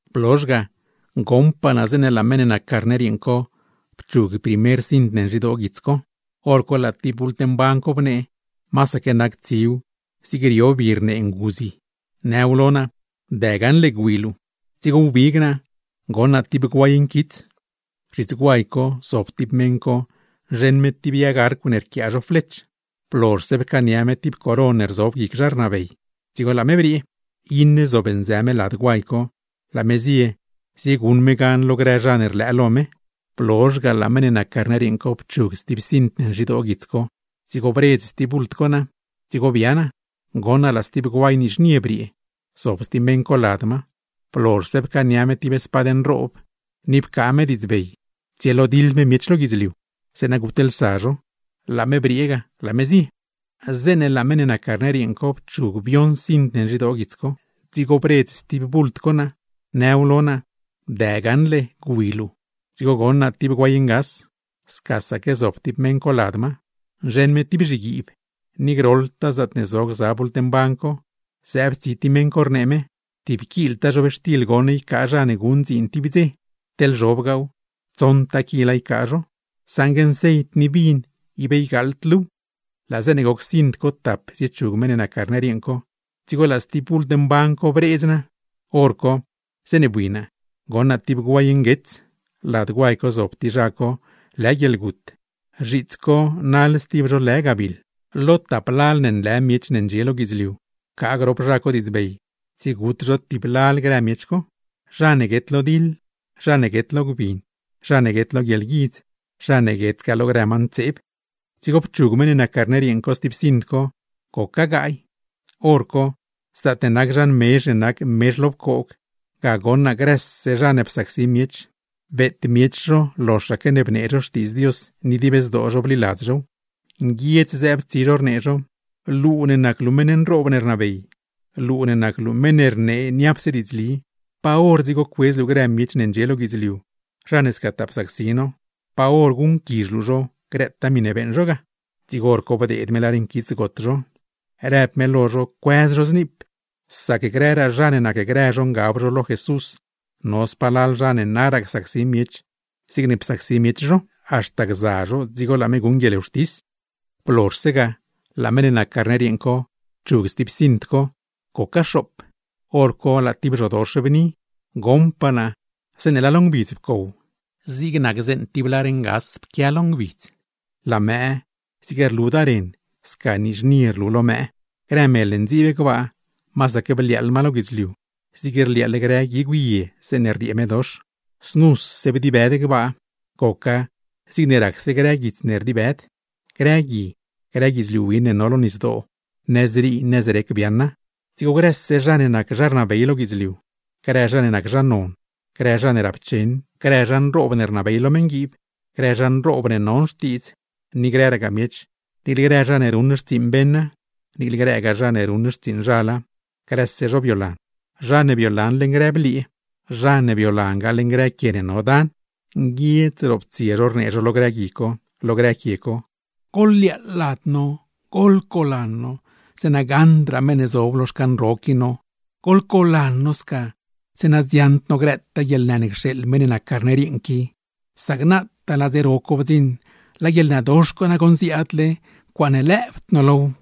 Blozh ga, goṉpaa naa zeeṉe laa meṉ ne nac Carner yeeṉ co pchug primer cint ne nzhidoo guits co. Horco laa tib bult mban co bnee; masaque nac tsiw zig rio bi rnee nguzi, nëw lo naa: ―¡Dë gaṉle gwi luu! Dzigo wbig naa, goṉ naa tib guay nquits. Zhits guay co zob tib meṉ co nzheṉ me tib yag arcw ne rquiaa zho flech; blozhse pcaania me tib coron ne rzob guic zha rnabey, dzigo laa me briee. Iṉe zob nzë me lad guay co, laa me zie zieguṉ me gan lo grë zha ne rlëë lo me. Blozh ga, laa meṉ ne nac Carner yeeṉ co pchug stib cint ne nzhidoo guits co. Dzigo bredz stib bult co naa. Dzigo bia naa, goṉ naa laa stib guay nizhnie briee, zob stib meṉ co lad ma. Blozhse pcaania me tib spad nroob, ni pcaa me diidzbey tsielodiḻ me miech lo guidzliu, zeeṉa gutlsa zho; laa me briee ga, laa me zie. Zeeṉe laa meṉ ne nac Carner yeeṉ co pchug bioṉ cint ne nzhidoo guits co, dzigo bredz stib bult co naa, nëw lo naa: ―¡Dë gaṉle gwi luu! Dzigo goṉ naa tib guay ngas, scasaque zob stib meṉ co lad ma, nzheṉ me tib zhiguiib. Ni groḻtaa zaatne zo gza bult mban co, zëëb tsi tib meṉ co, rnee me: ―Tib kiltaa zhobxtil goṉ ycaa zha ne guṉ dziin tib dze; teḻ zhobgaaw, tsoṉtaa kila ycaa zho; saṉgue nceit ni vin ib ygaaḻd luuw. Laa zeeṉe goc cint co tap ziechug meṉ ne nac Carner yeeṉ co, dzigo laa stib bult mban co bredz naa. Horco, zeeṉe bui naa, goṉ naa tib guay nguets; lad guay co zob tib zha co lë Guieḻgut; zhiits co naḻ stib zho lë Gabiḻ. Lo tap lal ne nlë miech ne ndxie lo guidzliu, pcaa grop zha co diidzbey tsiegut zho tib lal grë miech co; zha ne guet lo diḻ, zha ne guet lo gbin, zha ne guet lo guieḻguidz, zha ne guetgaa lo grë ma ntseeb. Dzigo pchug meṉ ne nac Carner yeeṉ co stib cint co, goca gaay. Horco, zaatne nac zhan mezh ne nac mezh lo pcoog, ga goṉ naa grëse zha ne psacsi miech, beet miech zho loxaque ne bnee zho Xtiidz Dios, ni dib zdoo zho bliladz zhow. Nguiedz zëëb tsi zho rnee zho: ―Luu ne nac luu meṉ nroob ne rnabey, luu ne nac luu meṉ ne rnee niapse diidzli, ¿pa hor dzigo cuedz luu grë miech ne ndxie lo guidzliu, zha ne scataa psacsi no? ¿Pa hor guṉquizh luu zho grëtaa miṉe beeṉ zho ga? Dzigo bdeed me lar nquits got zho; rëb me lo zho no cuëz zho zniip, sac grëraa zha ne nacgrë zho ngab zho lo Jesús, no spalal zha ne naraa csacsi miech zigne psacsi miech zho; haxta gza zho dzigo laa me guṉ guieḻwxtis. Blozhse ga, laa Carner yeeṉ co pchug stib cint co, goca xoop; hor co laa tib zhodox bni. Goṉpaa naa zeeṉe laa lo ngbidz pcow, zig nac zeeṉ tib lar ngas pquia lo ngbidz; laa mëë zig rludaa ren, sca nizhnie rlu lo mëë; grë mel ne ndziib gbaa, masaque bliaaḻ ma lo guidzliu zig rliaaḻ grë guigw yeeṉ zeeṉe rriee medox. Znuse bdibëd gbaa, goca zigne racse grë guits ne rdibëd; grë gui, grë guidzliu win ne no lo nisdoo, nëzrii nëzrec biaaṉa. Dzigo grëse zha ne nac zha rnabey lo guidzliu, grë zha ne nac zha non, grë zha ne rapcheṉ, grë zha nroob ne rnabey lo meṉguiib, grë zha nroob ne non xtiidz, ni grëragaa miech, niicle grë zha ne ruṉ xtsiiṉ beṉa, niicle grëgaa zha ne ruṉ xtsiiṉ zhala, grëse zho biolan, zha ne biolan leṉ grë bliee, zha ne biolangaa leṉ grëraa quie ne no dan; nguiedz roptsie zho rnee zho lo grë gui co, lo grë quie co: ―¡Goḻliaaḻ lad no, goḻcolan no, zeeṉa gaṉdraa meṉ ne zob lo xcan ro co no! ¡Goḻcolan no, zeeṉa dziaṉd no grëtaa guieḻnë ne cxeeḻ meṉ ne nac Carner yeeṉ co! ¡Sac nasi laa dze ro co bdziṉ! ¡Laa guieḻnëdox co nagoṉ ziaadle! ¡Ncuaaṉe lëëbd no low!